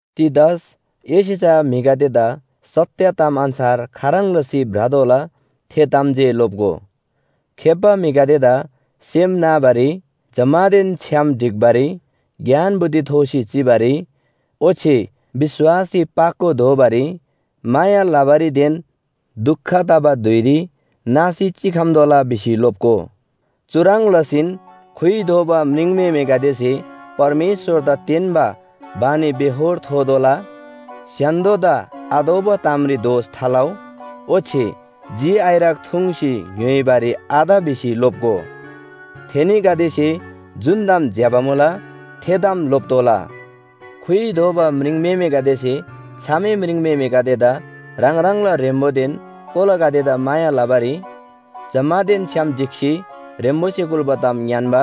तीतस, एसे चा म्‍हिगदेदा सत्‍य ताम अन्‍छार खाह्रङ् लसी भ्रतोःला थे ताम जे लोप्‍गो। खेप्‍बा म्‍हिगदेदा सेम नाबारी, जम्‍मानदेन छ्‌याम ढिक्‍बारी, ज्ञान बुद्धि थोसी चिबारी, ओच्‍छे विश्‍वासरी पाको दोबारी, माया लबारीदेन दुख तबा धुइरी नासी चिखम्‍तोःला भिसी लोप्‍गो। चुह्रङ् लसीन खुइ दोबा म्रिङम्‍हेमेगदेसे परमेश्‍वरदा तेन्‍बा बानीबेहोर थोतोःला, स्‍य्‍हान्‍दोदा आतोःबा तामरी दोष थालउ, ओच्‍छे झि आइरक थुङ्सी ङ्‌य्‍होइबारी आत भिसी लोप्‍गो। थेनीगदेसे जुन ताम ज्‍यबा मुला थे ताम लोप्‍तोःला। खुइ दोबा म्रिङम्‍हेमेगदेसे छामे म्रिङम्‍हेमेगदेदा ह्राङ ह्राङला ह्रेम्‍बोदेन कोलागदेदा माया लबारी, जम्‍मानदेन छ्‌याम ढिक्‍सी ह्रेम्‍बोसे कुल्‍बा ताम ङ्‌यान्‍बा,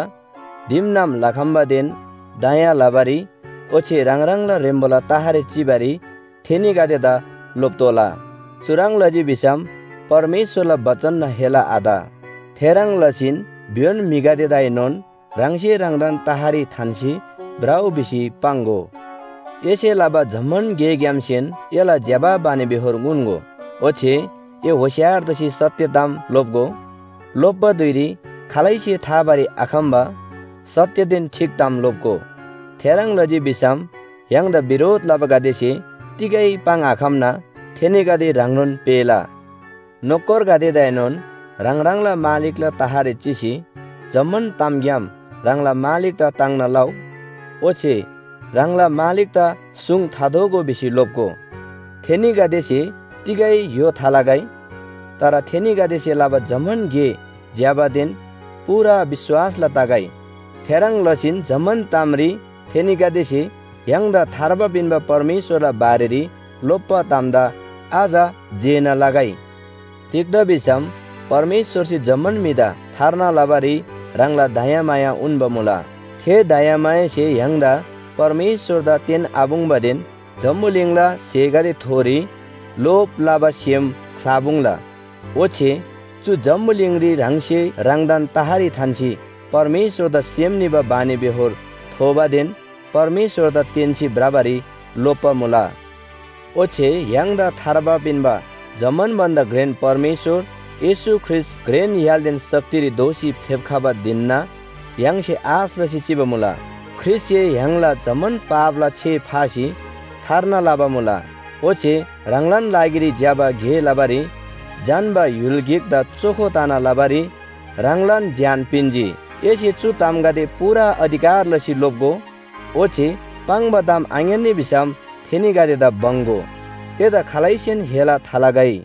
दिमनाम लखम्‍बादेन दया लबारी ओच्‍छे ह्राङ ह्राङला ह्रेम्‍बोला तहरी चिबारी थेनीगदेदा लोप्‍तोःला। चुह्रङ् लजी भिसम परमेश्‍वरला बचनना हेला आत। थेह्रङ् लसीन भ्‍योन म्‍हिगदेदाएनोन ह्राङसे ह्राङदान तहरी थान्‍सी भ्रउ भिसी पाङ्‍गो। एसे लबा जम्‍मान गेग्‍यामसेन एला ज्‍यबा बानीबेहोर उन्‍गो, ओच्‍छे ए होशियार तसी सत्‍य ताम लोप्‍गो। लोप्‍बा धुइरी खालैसे थाबारी आखम्‍बा सत्‍यदेन ठीक ताम लोप्‍गो। थेह्रङ् लजी भिसम य्‍हाङदा बिरोध लबागदेसे तिगै पाङ्आखम्‍ना थेनीगदे ह्राङनोन पेःला। नोकरगदेदाएनोन ह्राङ ह्राङला मालिकला तहरी चिसी जम्‍मान तामग्‍याम ह्राङला मालिकदा ताङ्ना लउ। ओच्‍छे ह्राङला मालिकदा सुङ थादोःगो भिसी लोप्‍गो। थेनीगदेसे तिगै य्‍हो थालगै। तर थेनीगदेसे लबा जम्‍मान गे ज्‍यबादेन पूरा विश्‍वासला तगै। थेह्रङ् लसीन जम्‍मान तामरी थेनीगदेसे य्‍हाङदा थार्बा पिन्‍बा परमेश्‍वरला बारेरी लोप्‍बा तामदा अझ जेना लगै। तिग्‍दा भिसम परमेश्‍वरसे जम्‍मान म्‍हिदा थार्ना लबारी ह्राङला दयामाया उन्‍बा मुला। थे दयामायासे य्‍हाङदा परमेश्‍वरदा तेन्‍आपुङ्बादेन जम्‍बुलिङला स्‍हेगदेथोरी लोभ लबा सेम ख्‍लापुङ्ला। ओच्‍छे चु जम्‍बुलिङरी ह्राङसे ह्राङदान तहरी थान्‍सी परमेश्‍वरदा सेम निबा बानीबेहोर थोबादेन परमेश्‍वरदा तेन्‍सी भ्रबारी लोप्‍बा मुला। ओच्‍छे य्‍हाङदा थार्बा पिन्‍बा जम्‍मान भन्‍दा घ्रेन परमेश्‍वर येशू ख्रीष्‍ट घ्रेन य्‍हालदेन शक्तिरी दोःसी फेप्‍खबा धिनना य्‍हाङसे आश लसी चिबा मुला। ख्रीष्‍टसे य्‍हाङला जम्‍मान पापला छे फासी थार्ना लबा मुला। ओच्‍छे ह्राङलान लागिरी ज्‍यबा गे लबारी झन्‍बा य्‍हुल गिकदा चोखो तना लबारी ह्राङलान ज्‍यान पिन्‍जी। एसे चु तामगदे पूरा अधिकार लसी लोप्‍गो, ओच्‍छे पाङ्बा ताम आङ्‌यान्‍नी भिसम थेनीगदेदा बङ्‍‌गो। एदा खालैसेन हेला थालगै।